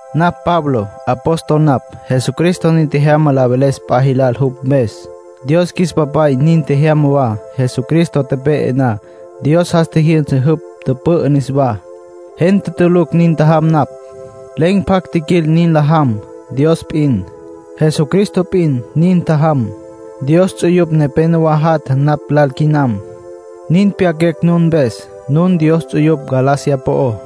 Napj Pablo. Apóstol napj. Jesucristo nin tjejyama la veles p'a jilal jupj mpes. Dios qjuis Papay nin tjejyama wa. Jesucristo tepe'e na, Dios jas tjijyünsa jupj, tüpü'ü niswá. Gente tulucj nin tjajam napj. Len̈ pjacj tjiquil nin la jam. Dios p'in, Jesucristo p'in, nin tjajam. Dios ts'uyupj nepénowa jatja napj lal quinam. Nin pyaquecj nun mpes. Nun Dios ts'uyupj Galacia po'ó.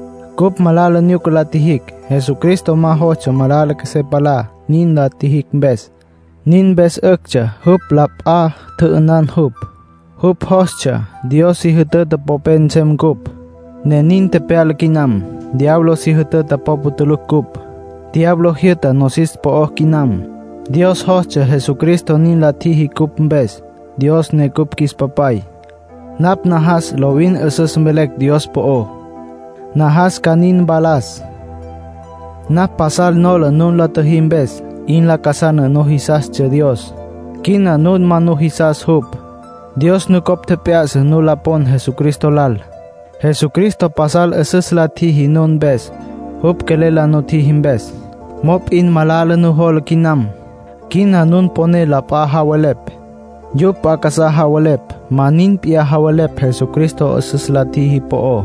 Cupj malala nyuca la tjijicj. Jesucristo ma jostsja malala qjuesé palá nin la tjijicj mpes; nin mpes 'üctsja jupj lal la p'a tjü'ünan jupj. Jupj jostsja Dios si jütüta popé nsem cupj, ne nin tepyala quinam. Diablo si jütüta popa tulucj cupj; diablo jyü'ta nosis po'ó quinam. Dios jostsja Jesucristo nin la tjiji cupj mpes, Dios ne cupj qjuis Papay. Napj najas lovin 'üsüs velecj Dios po'ó. Najas ca nin mpalas. Napj pasal nola nun la tjüjí mpes. 'In lacasana nun jisastsja Dios. Quina nun ma jisas jupj. Dios nucopj tjep'ya'sa nu la pon Jesucristo lal. Jesucristo pasal 'üsüs la tjiji nun mpes, jupj quelel la nutjiji mpes. Mop'in malala nujola quinam. Quina nun poné la p'a javelepj. Yupj p'a casá javelepj, ma nin p'iyá javelepj Jesucristo 'üsüs la tjiji po'ó.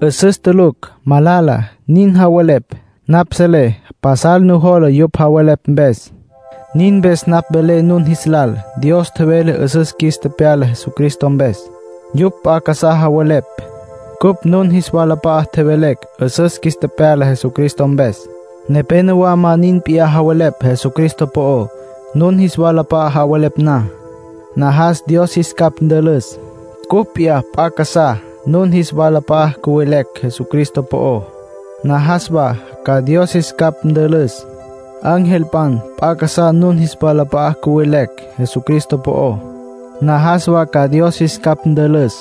'Üsüs tulucj, malala, nin javelepj. Napj selé pasal nujola yupj javelepj mpes. Nin mpes napj velé nun jis lal. Dios tjevele 'üsüs qjuis tepyala Jesucristo mpes. Yupj p'a casá javelepj. Cupj nun jis walap'a'a tjevelecj 'üsüs qjuis tepyala Jesucristo mpes. Nepénowa ma nin p'iyá javelepj Jesucristo po'ó, nun jis walap'a'a javelepj na. Najas Dios jis capj ntülüs. Cupj p'iyá p'a casá nun jis walap'a'a cüvelecj Jesucristo po'ó, najas wa ca Dios qjuis capj ntülüs. Angelpan p'a casá nun jis walap'a'a cüvelecj Jesucristo po'ó, najas wa ca Dios jis capj ntülüs.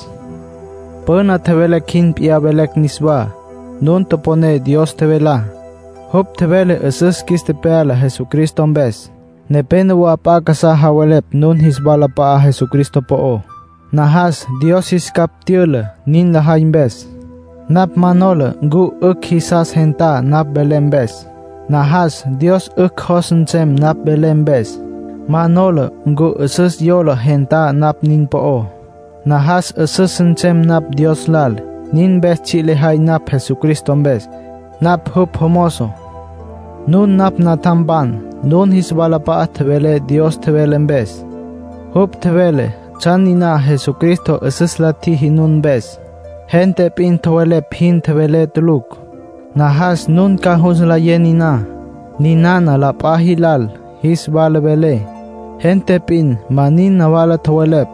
Püna tjevelecj jin p'iyá velé niswá. Nun toponé Dios tjevelá. Jupj tjevele 'üsüs qjuis tepyala Jesucristo mpes. Nepénowa p'a casá javelepj nun jis walap'a'á Jesucristo po'ó, najas Dios jis capj tyüla nin lajay mpes. Napj ma nola ncu 'ücj jisas gentá napj velé mpes. Najas Dios 'ücj jos nsem napj velé mpes. Ma nola ncu 'üsüs yola gentá napj nin po'ó. Najas 'üsüs nsem napj Dios lal. Nin mpes tsji' lejay napj Jesucristo mpes; napj jupj jomozo. Nun napj natjampan. Nun jis walap'a'a tjevelé Dios tjevele mpes. Jupj tjevele tsjan niná Jesucristo 'üsüs la tjiji nun mpes. Gente p'in tjowelepj jin tjevelé tulucj. Najas nun ca jus nlayé niná. Ninana la p'a jilal jis wala velé, gente p'in ma nin nawala tjowelepj.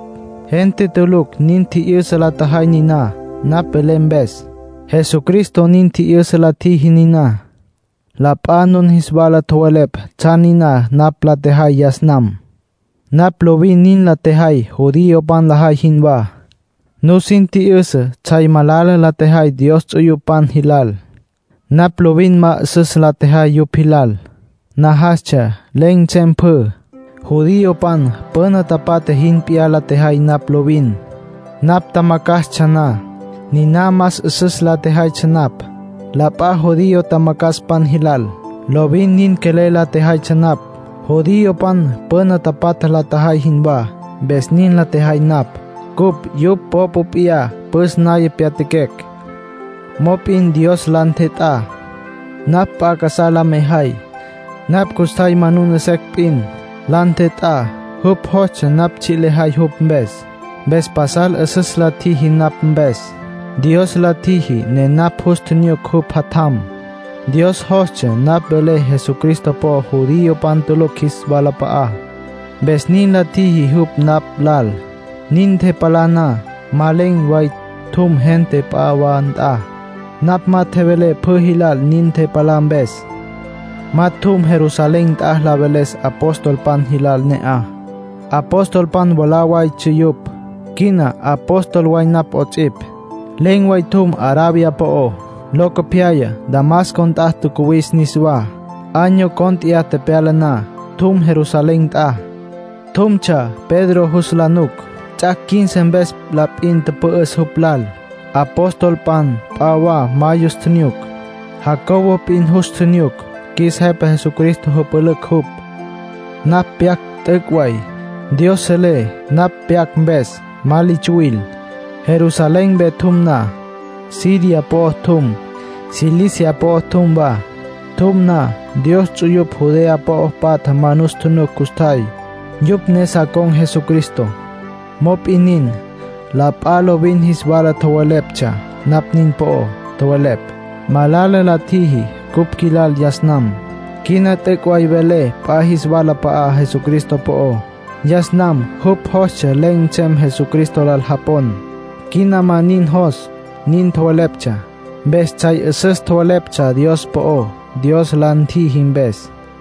Gente tulucj nin tji'yüsa la tjajay niná, napj velé mpes. Jesucristo nin tji'yüsa la tjiji niná. La p'a nun jis wala tjowelepj tsjan niná napj la tjejay yas nam. Napj lovin nin la tjejay judiopan lajay jinwá. Nusin tji'yüsa tsjay malala la tjejay Dios ts'uyupan jilal. Napj lovin ma 'üsüs la tjejay yupj jilal. Najastsja len̈ nsem pjü. Judiopan püna tapatja jin p'iyá la tjejay napj lovin. Napj tjamacjastsja na, niná más 'üsüs la tjejaytsja napj, la p'a judío tjamacjaspan jilal. Lovin nin quelel la tjejaytsja napj, judiopan püna tapatja la tjajay jinwá. Mpes nin la tjejay napj. Cupj yupj popa p'iyá püs naya pyatjaquecj. Mop'in Dios la ntjet'á, napj p'a casá la mejay. Napj custjay monuna secj p'in, la ntjet'á. Jupj jostsja napj tsji' lejay jupj mpes. Mpes pasal 'üsüs la tjiji napj mpes. Dios la tjiji ne napj jus tjinyuc jupj Jatjam. Dios jostsja napj velé Jesucristo po'ó judiopan tulucj jis walap'a'á, mpes nin la tjiji jupj napj lal. Nin ntepalá na, ma len̈ way tjum gente p'a wa nt'a. Napj ma tjevelé pjü jilal nin ntepalá mpes. Ma tjum Jerusalén nt'a la veles apostolpan jilal ne'aj. Apostolpan mwalá waytsja yupj. Quina apóstol way napj 'ots'ipj. Len̈ way tjum Arabia po'ó. Locopyaya Damasco nt'a tjacuwis niswá. Año cónt'eya tepyala na, tjum Jerusalén nt'a. Tjumtsja Pedro jus la nuc. Ts'ac' quince mpes la p'in tüpü'üs jupj lal. Apostolpan p'a wa ma yus tjinyuc. Jacobo p'in jus tjinyuc, qjuis Jepa Jesucristo jüpülücj jupj. Napj pyac, t'üc' way. Dios selé napj pyac mpes. Ma li tsuwil. Jerusalén mpe tjum na, Siria po'o tjum, Cilicia po'o tjum wa. Tjum na, Dios ts'uyupj Judea po'o patja ma nus tjunuc custjay, yupj ne sa con̈ Jesucristo. Mop'in nin, la p'a lovin jis wala tjoweleptsja napj nin po'ó. Tjowelepj: “Malala la tjiji cupj qjuilal yas nam. Quina t'üc' way vele p'a jis walap'a'á Jesucristo po'ó. Yas nam jupj jostsja len̈ nsem Jesucristo lal japon. Quina ma nin jos”, nin tjoweleptsja. Mpes tsjay 'üsüs tjoweleptsja Dios po'ó, Dios la ntjiji mpes.